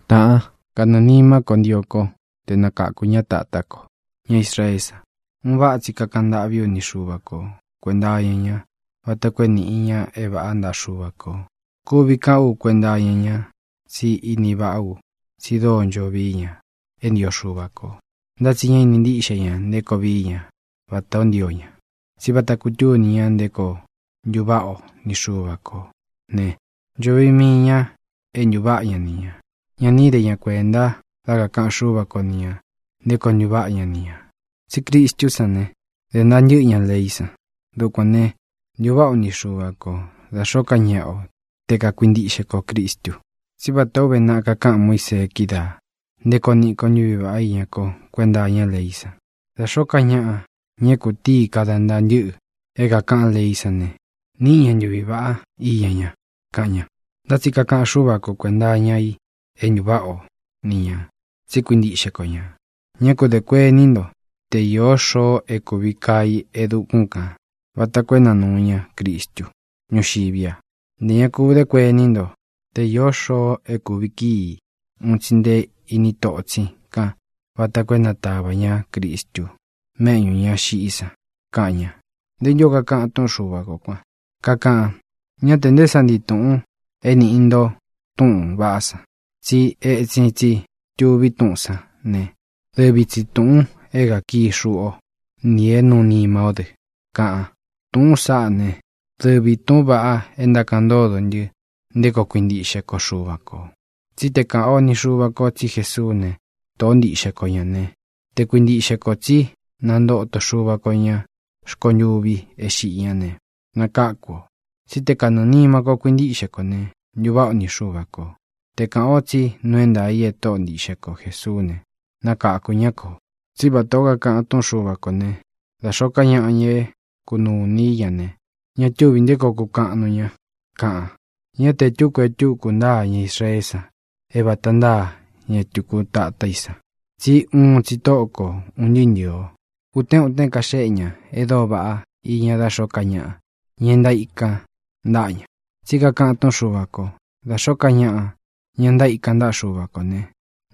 Tāꞌán, kanɨɨ̄ nimá ko ntio ko te nakāku ña tatá ko, ña Israeé san. Un váꞌa tsi kakaꞌan ntâꞌví u ni Xuva ko kuēnta iña ña vata koo é nīꞌi ña é vāꞌá ntaꞌa Xuva kō. Kuvi kaꞌán u kuenta iña ña tsí ini vaꞌá u tsi dóo ncho vií ña é ntio Xuva kō, ntá tsi ñá ini ntíꞌxe ña nté koo vií ña vatā ó ntio ña. Tsí vata kutúni ña nté koo ntuváꞌa o ni Xuva kō ne, ncho vií mii ñā é ntuváꞌa ña ni ñā. Ña ni íde ña kuēnta dá kakāꞌan Xúva ko ni ñā nté koo ntuváꞌa ña ni ñā. Tsí Cristú san ne, de ntaa ntɨ́ꞌɨ ña leí san. Dukuān ne, ntuváꞌa o ni Xuva ko, da xōó ka ñaꞌa o, te kakuintiꞌxe kō Cristu. Tsí vatā ó uve naꞌa kakáꞌan Muísee kídaā nté koo niꞌi ko ntuví vaꞌá iña ko kuenta iñá leí san: “Da xōó ka ñaꞌa, ña é kūtíi kada ntaa ntɨ́ꞌɨ é kākaꞌán leí san ne, níꞌi ña ntuvi vāꞌá iña ña”, kaꞌan ña. Ntá tsi kakaꞌan Xúva ko kuēnta iña i é ntuváꞌa o ni ñā tsi kuíntiꞌxe ko ñā: “Ñá ku dē kuení nto te īó xoo é kūvi kaa i e dukún kān vata koo é nanūu ña Cristu ñúxiví a. Ntē ña ku dé kuení nto te īó xoo é kūvi kíi un tsi nte iní totsin kan vata koo é natavā ñá Cristu méꞌñū ña xiꞌí san”, kaꞌan ña. ¿Nté ntū ó kakaꞌan túꞌun Xuva kō kuan? Kakaꞌan: “Ñá te nté sa ntii tūꞌun é nīꞌi nto túꞌūn vaꞌá san, tsí etsin tsi tuví túꞌūn sán ne, dɨvi tsi tūꞌun é kākií xuꞌu o nī é nūu nima ó dɨ”, kaꞌan. Tūꞌún saꞌá ne, dɨvī túꞌūn vaꞌa é ntákaꞌan ntódo ntɨ nté koo kuintiꞌxe ko Xuva kō. Tsí te kāꞌan ó ni xūꞌu ko tsí Jesuú ne, Tōꞌó ntiꞌxe ko ñā ne, te kuintiꞌxe kō tsí nantoto Xúva ko ñā rkontuvi é xiꞌi ñá ne, nakáku ō. Tsí te kanɨɨ̄ nima kó kuintiꞌxe kō ne, ntuváꞌa o ni Xuva kō. Te kāꞌan o tsí nuu é ntaā i e Tóꞌo ntiꞌxe ko Jēsuú ne, nakáku ña kō. Tsí vatā ó kakaꞌan túꞌun Xuva kō ne: “Da xōó ka ñaꞌa, ña é kānuu iní i ña ne, ña túvī nté koo kukaꞌan nuu ña”, kaꞌan. Ñá te e túku e túku ntáa ña Israeé san é vāta ntáa ña tuku tatá i san. Tsí uun tsi Tóꞌo ko ūn ntɨɨ́ ntɨ̄ɨ o. Utén utén kaxéꞌe ña e dóo vaꞌá iña dá xōó ka ñaꞌa, ña e ntaíkan ntáꞌa ña. Tsí kakaꞌan túꞌun Xuva kō: “Da xōó ka ñaꞌa, ña ntaíkan ntaꞌa Xuva kō ne,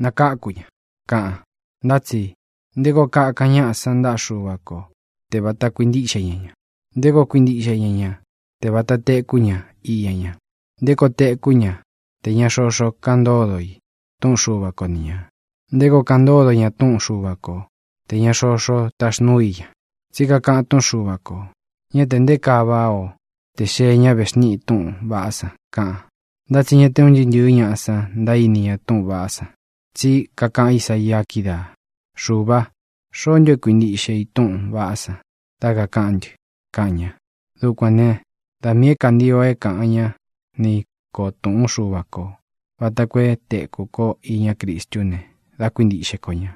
nakáku ña”, kaꞌan. Ntá tsi, ¿nté koo kakan ñáꞌa san ntaꞌa Xúva ko te vāta kuintíꞌxe ña ña? ¿Nté koo kuintiꞌxe ña ña te vāta tekú ña iña ña? ¿Nté koo tekú ña tē ña xoxo kaꞌan ntódo i túꞌun Xuva ko ni ñā? ¿Nté koo kaꞌan ntódo ña túꞌun Xuva ko tē ña xoxó taxnuu i ña? Tsí kakaꞌan túꞌun Xuva kō: “Ñá te nté kaa váꞌa o tē xee ñá vexníꞌi túꞌūn vaꞌá san”, kaꞌan. Ntá tsi ña te un ntɨɨ́ ntɨ̄ɨ́ ñaꞌa san ntaíni ña túꞌūn vaꞌá san. Tsí kakaꞌan Ísaia kídaā: “Xuvā, ¿xoó ntu e kuíntiꞌxe i túꞌūn vaꞌá san dá kakāꞌán ntɨ?”, kaꞌan ña. Dukuān né, da miī é kantio é kāꞌan ñá nī ko túꞌun Xuva ko vāta koo é tēku ko iña Cristú ne, dá kuintiꞌxe ko ñā.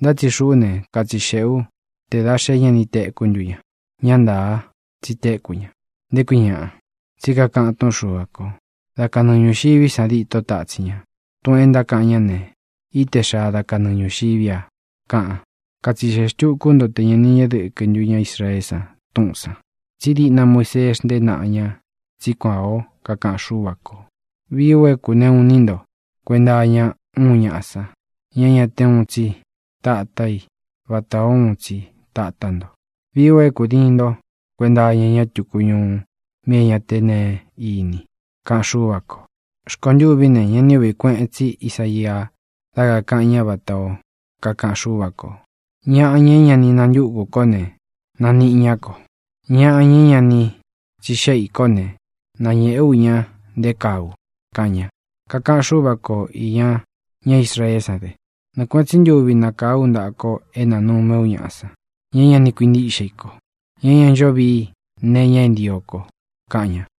Ntá tsi xuꞌú ne, katsixeꞌē ú te dā xé ña ni tekú ntu ña. Ñá ntāa, tsi téku ña, ¿nté kui ñaꞌa? Tsí kakaꞌan túꞌun Xuva kō: Da kanɨɨ ñūxiví san dîtó tatsin ña. Tūꞌun e ntákaꞌan ñá ne, íte xaa da kanɨɨ ñūxiví a, kaꞌan. Katsixeꞌe xtukū ú nto te ña ni ñéꞌe dɨkɨ ntú ña Israeé san túꞌūn san. Tsí diꞌna Muisee xntée naꞌa ña tsí kuān ó kakaꞌan Xúva kō: Vií u é kūneꞌu iní nto kuenta iña úun ñaꞌa san, ña é ña te uun tsi tatá i vatā ó uun tsi tatá nto. Vií u é kūdiin nto kuenta iña ñá tuku ñuu, mí é ña te neé ini, kaꞌan Xúva kō. Rkontûví ne, ñá ni ūꞌví kueꞌen tsí Isaia dá kakāꞌan ñá vatā ó kakaꞌan Xúva kō: Ñaꞌa, ña é ña ni nantúku kó ne, nāniꞌi ñá ko. Ñaꞌa, ña é ña ni tsixéꞌe ī kó ne, nañēꞌe ú ña nté kaa u, kaꞌan ña. Kakaꞌan Xúva ko īña ñá Israeé san dɨ: “Nɨɨ kuēꞌen tsí ntuvi nakáa ú ntaꞌa ko é nānumé u ñaꞌa san, ña é ña ni kuintíꞌxe i ko, ña é ña ncho vii nee iña é ntio ko”, kaꞌan ña.